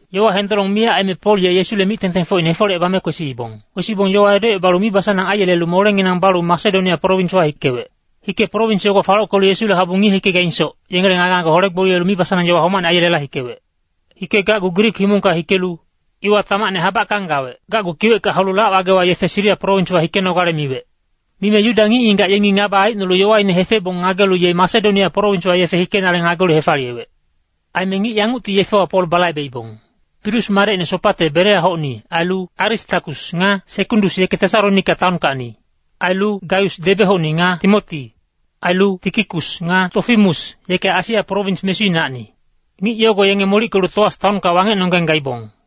Yowa hendolong miyac aime Pol ye Yesule mic-tengtengfocine hefolecebame kwesiibong. Kwesibong yowa edocebalu mibasanang aiyelelu molenginang balu Masedonia prowinswa hikewec. Hike prowins yogo falockelu Yesule habu ngiye-hikegaingsoc, yengele ngage-ngage hole-gboliyelu mibasanang yowa homacne aiyelela hikewec. Hikegacgu Grik himongka hikelu iwa tamacne habackang gawec. Gacgu kiwecka haulu lac-wagewa yefe Siria prowinswa hikenogale miwec. Mime Yuda ngic-ngigac yengi ngaba aicnolu yowaine hefebong ngagelu ye Masedonia prowinswa yefe hikenale ngagelu hefaliyewec. Aime ngic yangucti yefewa Pol balaibeibong. Pirus madecine Sopate Bereahocni, ailu Aristakus nga Sekundus yeke Tesalonika taonkacni. Ailu Gaius Debe-hocni nga Timoti. Ailu Tikikus nga Tofimus, yeke Asia prowins mesuinacni. Ngic yogo yenge molickelu Toas taonka wangecnonggeng gaibong.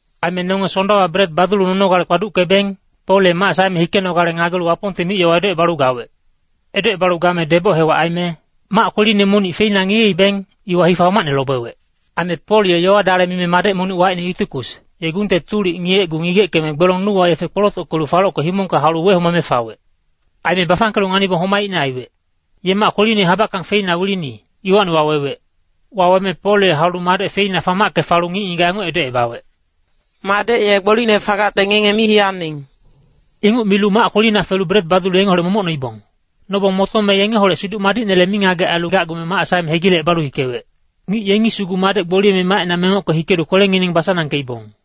Aime nonge Sondawa bret badulu nonogale kpaduckebeng, Pol ye mac saeme hikenogale ngagelu Wapongte mic-yowa edocebalu gawec. Edocebalu game deboc hewac aime mac kweline monic feina ngiyeibeng, iwa hifa homacne lobewec. Aime Pol ye yowa-dale mime madec monic wacine Yutikus, ye gungte tulic ngiyecgu ngigeckeme gbelong nuwa yefe kpolotockelu falocke himongka haulu wehomame fawec. Aime bafangkelu nganibong homaicne aiwec. Ye mac kweline habackang feina wilini, iwacni wawewec. Waweme Pol ye haulu madec feina famacke falu ngic-ngigac yanguc edocebawec, “Madec ye gbolicne fagacte ngenge mi hiyaning.” Inguc milu mac kwelina felu bret badulu yengeholec momoc noibong. Nobong motome yengeholec Siduc Madicnele mingagec ailu gacgume mac saeme hegilecebalu hikewec. Ngic yengi sugu madec gboliyeme macina mengocke hikelu kwelengineng basanangkeibong.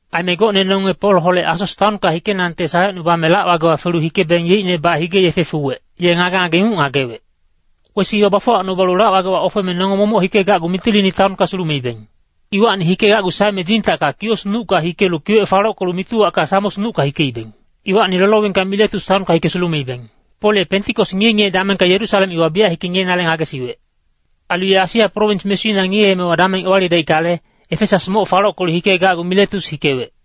Aime gocne nonge Polholec Asos taonka hikenangte salecnubame lac-wagewa felu hikebeng yeicnebac hige-yefe fuwec, ye ngage-ngage inguc ngagewec. Kwesi iwa bafuwacnubalu lac-wagewa ofeme nonge momoc hikegacgu Mitilini taonka sulumeibeng. Iwacni hikegacgu saeme Dzintacka Kios nucka hikelu kiwec falockelu Mituwacka Samos nucka hikeibeng. Iwacni Lolowingka Miletus taonka hike sulumeibeng. Pol ye Pentikos ngiye-ngiye damengka Yerusalem iwa biyac hike ngiyenale ngagesiwec. Ailu ye Asia prowins mesuina ngiyeemewa dameng ewalidaickale, Efesas moc falockelu hikegacgu Miletus hikewec.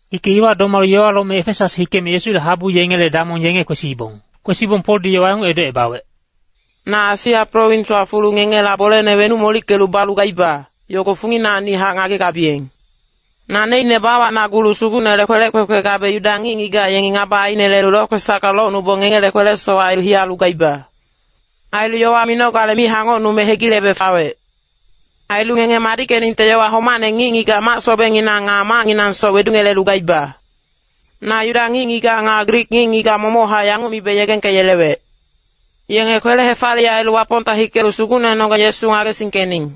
Hike iwa domalu yowa lome Efesas hikeme Yesule habu yengele damong yenge kwesiibong. Kwesibong Poldi yowa yanguc edocebawec, “Na Asia prowinswa fulu ngengela bolene wenuc molickelu balu gaiba, yogo funginacnihac ngagegabiyeng. Naneicne bawacnagulu Sugucnele kwelec kwekwe gabe Yuda ngic-ngigac yengi ngaba ainelelu lokwesacka locnubong ngengele kwele-sowac ailu hiyalu gaiba. Ailu yowa minogale mi hangocnume hegilebe fawec. Ailu ngenge madickeningte yowa homacne ngic-ngigac mac-sobengnginang nga macnginangsoc wedungelelu gaiba. “Na Yuda ngic-ngigac nga Grik ngic-ngigac momochac yanguc mibe yegengkeyelewec. Yenge kwele-hefaliyec ailu Wapongta hikelu Sugucnenonggeng Yesu ngagesingkening.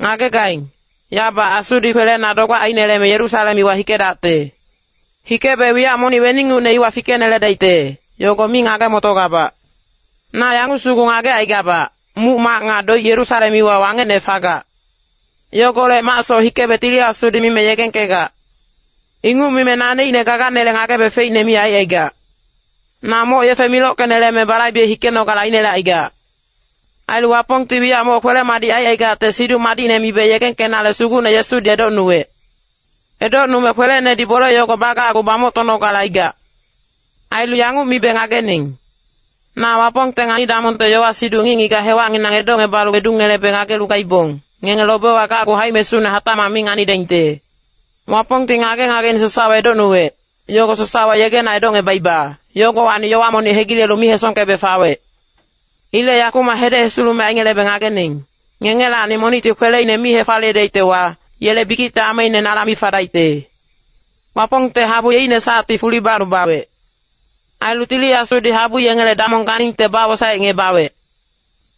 Ngagegaing, yabac Asudi kwelena dogbac aineleme Yerusalem iwa hikedacte. Hikebe wiyac monic weningucne iwa fikeneledaicte, yogo mi ngage-motogabac. Na yanguc sugu ngagecaigabac, muc-mac nga doic Yerusalem iwa wangecne fagac. Yogolec macsoc hikebe Tili Asudi mime yegengkegac. Inguc mime naneicne gaganele ngagebe feicne mi aicaigac. Na moc yefe milockeneleme balaibe hikenogale ainelecaigac. Ailu Wapongti wiyac moc kwele-madic aicaigacte Siduc Madicne mibe yegengkenale Sugucne Yesudi edocnuwec. Edocnume kwelenedi bole yogo bagacgu bamoctonogale aigac. “Ailu yanguc mibe ngagening. Na Wapongte ngani-damongte yowa-siduc ngic-ngigac hewacnginang edocngebalu wedungelebe ngagelu gaibong, ngenge lobewa gacgu haic-mesune hatacmac mi nganidaingte. Wapongti ngage-ngageine sasawa edocnuwec, yogo sasawa yegena edocngebaiba, yogowacni yowa monic hegilelu mi hesongkebe fawec. Ilec yakumac hedec hesulumec aingelebe ngagening, ngengelacni monicti kweleine mi hefaliyedaictewa, yele bikicte ameine nala mi fadaicte. “Wapongte habu yeicne sacti fuli bacnubawec. Ailu Tili Asudi habu yengele damong ganingte bawosaecngebawec.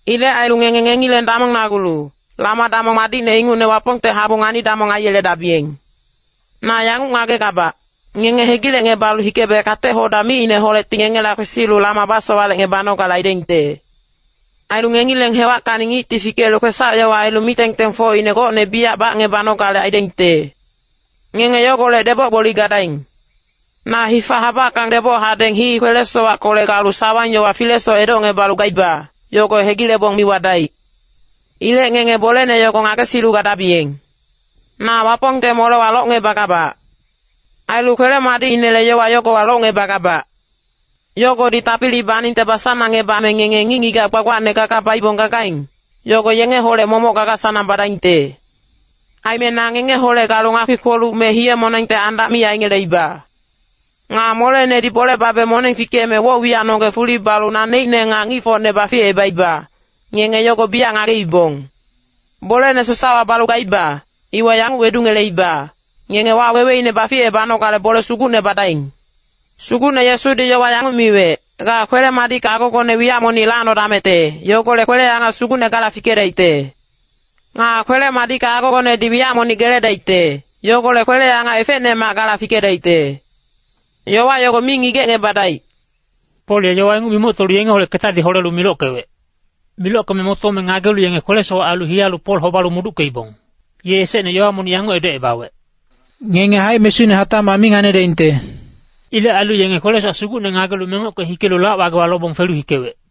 Ilec ailu ngenge ngengileng damongnagulu, lama-damong madicne ingucne Wapongte habu ngani-damong aiyeledabiyeng. Na yanguc ngagegabac, ngenge hegilecngebalu hikebe kate-hoda micineholecti ngengela kwesilu lama basowalecngebanogale aidaingte. Ailu ngengileng hewackacni ngicti fikelu kwesac-yowa ailu mic-tengtengfocine gocne biyac bacngebanogale aidaingte. Ngenge yogolec deboc-gboli gadaing. Na hifa habackang deboc hadeng hii kwele-sowackolec galu sawang-yowa filesoc edocngebalu gaiba, yogo hegilebong mi wadaic. Ilec ngenge bolene yogo ngagesilu gadabiyeng. “Na Wapongte molewa locngebagabac. Ailu kwele-madicinele yowa yogowa locngebagabac. Yogodi tapili baningte basanangngebame ngenge ngic-ngigac gbagbacne gaga baibong gagaing, yogo yengeholec momoc gaga-sanang badaingte. Aime na ngengeholec galu ngakpi-kpoluc me hiye-monengte andac mi aingeleiba. Nga molenedi bole babe moneng fikeme woc-wiyacnonggeng fuli balu naneicne nga ngicfocne baficebaiba, ngenge yogo biyac ngageibong. Bolene sasawa balu gaiba, iwa yanguc wedungeleiba, ngenge waweweine baficebanogale bole sugucne badaing. Sugucne Yesudi yowa yanguc miwec, ‘Ga kwele-madicka agogone wiyac monic lacnodamecte, yogolec kwele-angac sugucne gala fikedaicte. Nga kwele-madicka agogonedi wiyac monic geledaicte, yogolec kwele-angac efecnemac gala fikedaicte.’ Yowa yogo mi ngigecngebadaic.” Pol ye yowa inguc mimoctolu yengeholec ketadi holelu milockewec. Milockeme motome ngagelu yenge kwele-sowac ailu hiyalu Pol hobalu muduckeibong. Ye esecne yowa monic yanguc edocebawec, “Ngenge haic-mesune hatacmac mi nganidaingte.” Ilec ailu yenge kwele-sowac sugucne ngagelu mengocke hikelu lac-wagewa lobong felu hikewec.